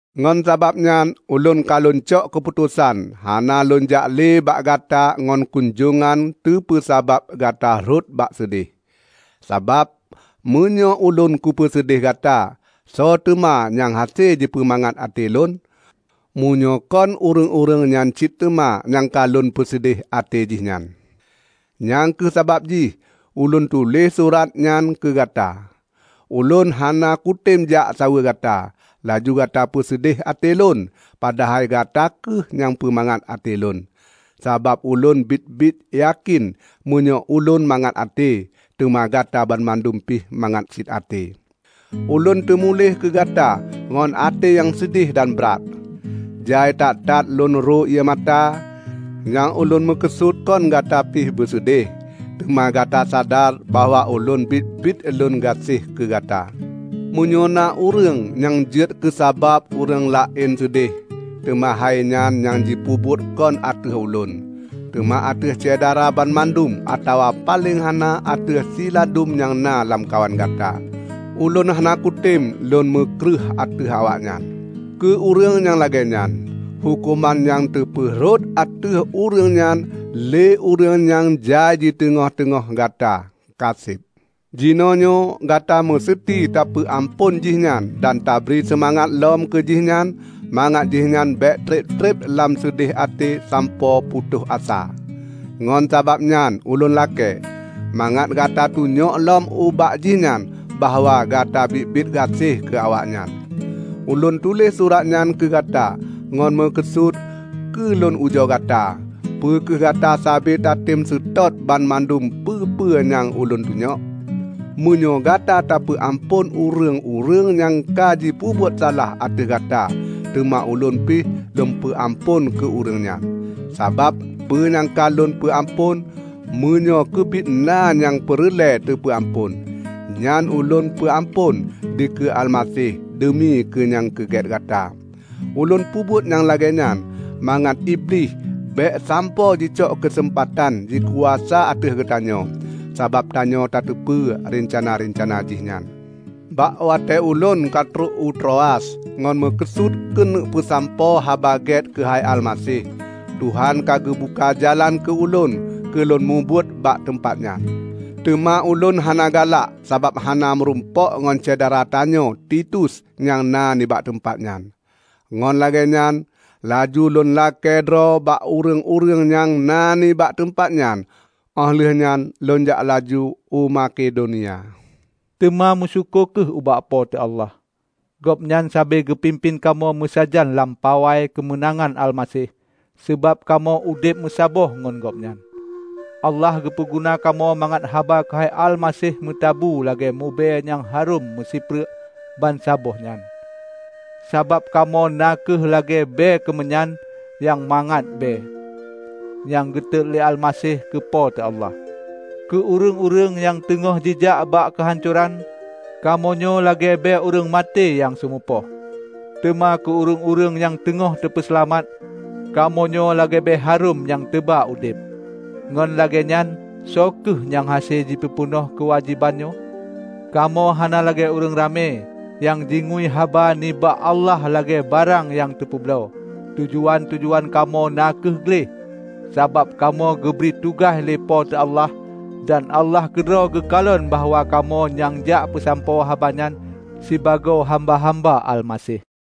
Ngon sababnyan ulôn ka lôn cok keuputosan hana lônjak le bak gata ngon kunjongan teupeusabab gata rhot bak seudeh. Sabab meunyoe ulôn kupeuseudeh gata, soe teuma nyang hase jipeumangat até lôn, meunyoe kon ureuëng-ureuëng nyan cit teuma nyang ka lôn peuseudeh até jih nyan? Nyang kheueh sabab jih ulôn tuléh surat nyan keu gata. Ulôn hana kutem jak saweue gata, laju gata peuseudeh até lôn padahai gata kheueh nyang peumangat até lôn. Sabab ulôn biet-biet yakén meunyoe ulôn mangat até, teuma gata banmandum pih mangat cit até. Ulôn teumuléh keu gata ngon até nyang seudeh dan brat, jai that-that lôn ro ié mata. Nyang ulôn meukeusut kon gata pih beuseudeh, teuma gata sadar bahwa ulôn biet-biet lôn gaséh keugata. Meunyoe na ureuëng nyang jeuet keusabab ureuëng laén seudeh, teuma hainyan nyang jipeubuet kon ateueh ulôn, teuma ateueh Syedara banmandum atawa paleng hana ateueh siladum nyang na lamkawan Gata. Ulôn hana kutem lôn meukreueh ateueh awaknyan. Keu ureuëng nyang lagée nyan, huköman nyang teupeu rhot ateueh ureuëng nyan lé ureuëng nyang jai di teungoh-teungoh Gata, kaseb. Jinoenyoe gata meuseuti tapeu amphon jihnyan dan tabri seumangat lom keu jihnyan mangat jihnyan bék treb-treb lam seudeh até sampoe putôh asa. Ngon sabab nyan ulôn lakée, mangat gata tunyok lom ubak jihnyan bahwa gata biet-biet gaséh keu awaknyan. Ulôn tuléh surat nyan keu gata ngon meukeusut keu lôn ujoe gata, peu kheueh gata sabe tatem seutôt banmandum peue-peue nyang ulôn tunyok. Meunyoe gata tapeu amphon ureuëng-ureuëng nyang ka jipeubuet salah ateueh gata teuma ulôn pih lôn peu amphon keu ureuëng nyan. Sabab peue nyang ka lôn peu amphon -- meunyoe keubiet na nyang peureulée teupeu amphon -- nyan ulôn peu amphon dikeue Almaseh deumi keu nyang keugét gata. Ulôn peubuet nyang lagée nyan mangat Iblih bék sampoe jicok keuseumpatan jikuasa ateueh geutanyoe; sabab tanyoe tateupeue reuncana-reuncana jih nyan. Bak watée ulôn ka trok u Troas ngon meukeusut keuneuk peusampoe Haba Gét keuhai Almaseh, Tuhan ka geubuka jalan keu ulôn keu lôn mubuet bak teumpat nyan. Teuma ulôn hana galak sabab hana meurumpok ngon syedara tanyoe Titus nyang na nibak teumpat nyan. Ngon lagée nyan laju lôn lakée droe bak ureuëng-ureuëng nyang na nibak teumpat nyan óh lheueh nyan lôn jak laju u Makedonia. Teuma meusyukoe kheueh ubak Po teu Allah! Gobnyan sabe geupimpén kamoe meusajan lam pawai keumeunangan Almaseh sabab kamoe udeb meusaboh ngon Gobnyan. Allah geupeu guna kamoe mangat haba keuhai Almaseh meutabu lagée mubée nyang harom meusipreuk bansaboh nyan. Sabab kamoe na kheueh lagée bée keumeunyan nyang mangat bée, nyang geutot lé Almaseh keu Po teu Allah. Keu ureuëng-ureuëng nyang teungoh jijak ubak keuhancoran, kamoe nyoe lagée bée ureuëng maté nyang seumeupoh; teuma keu ureuëng-ureuëng nyang teungoh teupeuseulamat, kamoe nyoe lagée bée harôm nyang teuba udeb. Ngon lagée nyan, soe kheueh nyang hase jipeupeunoh keuwajéban nyoe? Kamoe hana lagée ureuëng ramé nyang jingui haba nibak Allah lagée barang nyang teupeubloe. Tujuan-tujuan kamoe na kheueh gleh, sabab kamoe geubri tugaih lé Po teu Allah. Dan Allah keudroe geukalon bahwa kamoe nyang jak peusampoe haba nyan sibagoe hamba-hamba Almaseh.